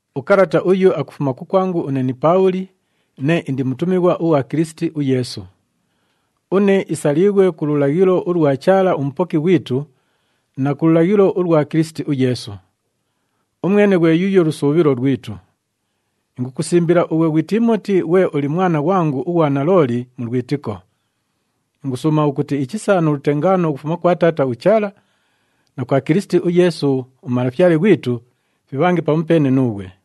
Ukalata uyu akufuma kukwangu une ni Paabhuli, nee indi mutumighwa ughwa Kilisiti uYeesu. Une isaliighwe ku lulaghilo ulwa Chaala uMupoki ghwitu na ku lulaghilo ulwa Kilisiti uYeesu. Umwene ghwe yuuyo lusuubhilo lwitu. Ingukusimbila ughwe ghwi Tiimoti ghwe uli mwana ghwangu ughwa nalooli mu lwitiko. Ingusuuma ukuti ichisa nu lutengaano ukufuma kwa Taata uChaala na kwa Kilisiti uYeesu uMalafyale ghwitu fibhange pamupeene nuughwe.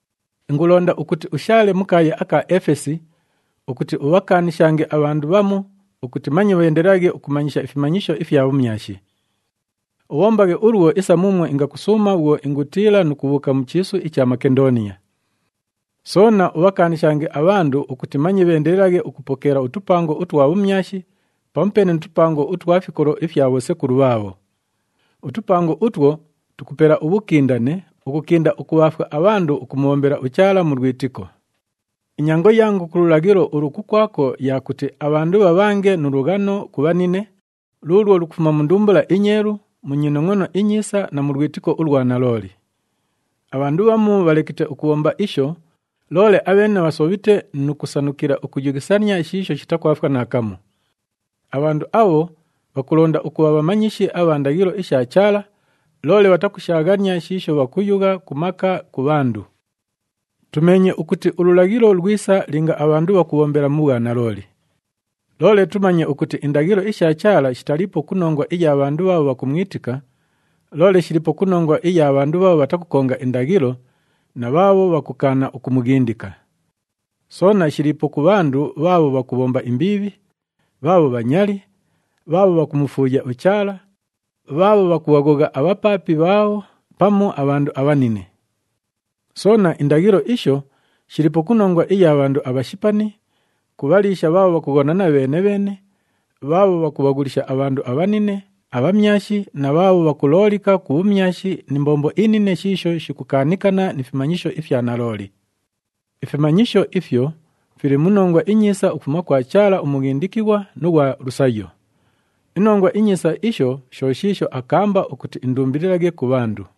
Ingulonda ukuti ushaale mu kaaya aka Efesi ukuti ubhakaanishange abhandu bhamu ukuti manye bheendelelaghe ukumanyisha ifimanyisho ifya bhumyashi. Ubhombaghe ulwo isa muumwo ingakusuuma bhwo ingutiila nu kubhuuka mu chiisu icha Makendooniya. Soona ubhakaanishange abhandu ukuti manye bheendelelaghe ukupokeela utupango utwa bhumyashi pamupeene nu tupango utwa fikolo ifya bhosekulu bhaabho. Utupango utwo tukupela ubhukindane ukukinda ukubhaafwa abhandu ukumubhombela uChaala mu lwitiko. Inyango yangu ku lulaghilo ulu kukwako ya kuti abhandu bhabhange nu lughano ku bhanine, luulwo lukufuma mu ndumbula inyeelu, mu nyinongʼono inyiisa na mu lwitiko ulwa nalooli. Abhandu bhamu bhalekite ukubhomba isho, loole abheene bhasobhite nu kusanukila ukuyughisania shiisho shitakwafwa naakamu. Abhandu abho bhakulonda ukubha bhamanyishi abha ndaghilo isha Chaala, loole bhatakushaaghania shiisho bhakuyugha ku maka ku bhandu. Tumeenye ukuti ululaghilo lwisa linga abhandu bhakubhombela mu bhwanalooli. Loole tumanye ukuti indaghilo isha Chaala shitaliipo ku nongwa iya bhandu bhaabho bhakumwitika, loole shiliipo ku nongwa iya bhandu bhaabho bhatakukonga indaghilo na bhaabho bhakukaana ukumughindika. Soona shiliipo ku bhandu bhaabho bhakubhomba imbiibhi, bhaabho bhanyali, bhaabho bhakumufuuya uChaala, bhaabho bhakubhaghogha abhapaapi bhaabho pamu abhandu abhanine. Soona, indaghilo isho shiliipo ku nongwa iya bhandu abhashipani, ku bhaliisha bhaabho bhakughonana bheene-bheene, bhaabho bhakubhaghulisha abhandu abhanine, abhamyashi na bhaabho bhakuloolika ku bhumyashi ni mbombo inine shiisho shikukaanikana ni fimanyisho ifya nalooli. Ifimanyisho ifyo fili mu Nongwa iNyiisa ukufuma kwa Chaala uMughindikighwa nu ghwa lusayo. INongwa iNyiisa isho sho shiisho akaamba ukuti indumbililaghe ku bhandu.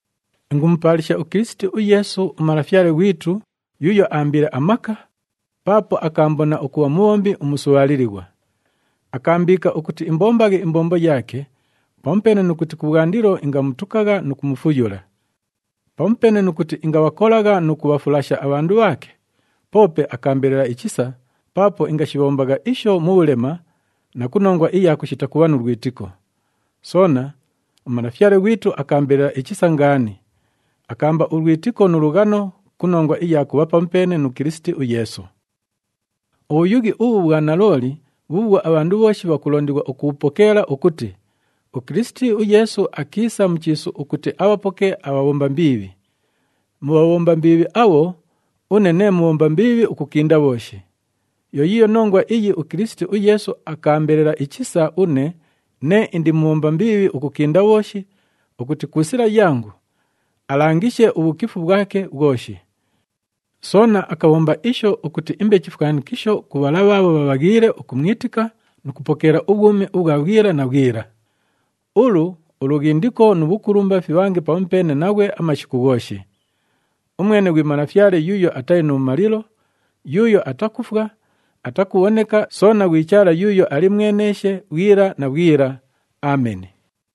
Ingumupaalisha uKilisiti uYeesu, uMalafyale ghwitu yuuyo aambiile amaka, paapo akaambona ukubha mubhombi umusubhaalilighwa. Akaambiika ukuti imbombaghe imbombo yaake, pamupeene nu kuti kubhwandilo ingamutukagha nu kumufuyula. Pamupeene nu kuti ingabhakolagha nu kubhafulasha abhandu bhaake, poope akaambelela ichisa paapo ingashibhombagha isho mu bhulema na ku nongwa iya kushita kubha nu lwitiko. Soona, uMalafyale ghwitu akaambelela ichisa ngaani, akaamba ulwitiko nu lughano ku nongwa iya kubha pamupeene nu Kilisiti uYeesu. Ubhuyughi ubhu bhwa nalooli bhuubhwo abhandu bhooshi bhakulondighwa ukubhupokeela ukuti, “UKilisiti uYeesu akiisa mu chiisu ukuti abhapoke abhabhomba mbiibhi.” Mu bhabhomba mbiibhi abho, une nee mubhomba mbiibhi ukukinda bhooshi. Yo yiiyo nongwa iyi uKilisiti uYeesu akaambelela ichisa une nee indi mubhomba mbiibhi ukukinda bhooshi ukuti ku sila yangu, alangishe ubhukifu bhwake bhwoshi. Soona akabhomba isho ukuti imbe chifwanikisho ku bhala bhaabho bhabhaghiile ukumwitika nu kupokeela ubhwumi ubhwa bhwila na bhwila. Ulu, ulughindiko nu bhukulumba fibhange pamupeene naghwe amashiku ghooshi. Umwene ghwi Malafyale yuuyo atali nu bhumalilo, yuuyo atakufwa, atakubhoneka, soona ghwi Chaala yuuyo ali mweneeshe bhwila na bhwila. Ameni.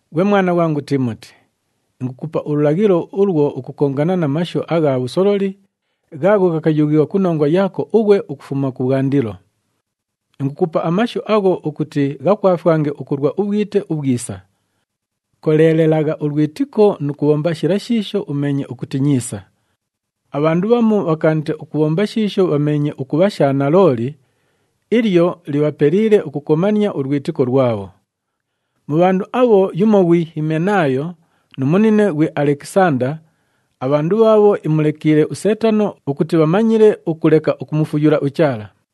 Ghwe mwana ghwangu Tiimoti, ingukupa ululaghilo ulwo ukukongana na mashu agha bhusololi ghaagho ghakayughighwa ku nongwa yaako ughwe ukufuma kubhwandilo. Ingukupa amashu agho ukuti ghakwafwange ukulwa ubhwite ubhwisa. Koleelelagha ulwitiko nu kubhomba shila shiisho umeenye ukuti nyiisa. Abhandu bhamu bhakaanite ukubhomba shiisho bhameenye ukubha sha nalooli, ilyo libhapeliile ukukomania ulwitiko lwabho. Mu bhandu abho yumo ghwi Himenaayo, nu munine ghwi Alekisanda, abhandu bhaabho imulekiile uSeetano ukuti bhamanyile ukuleka ukumufuyula uChaala.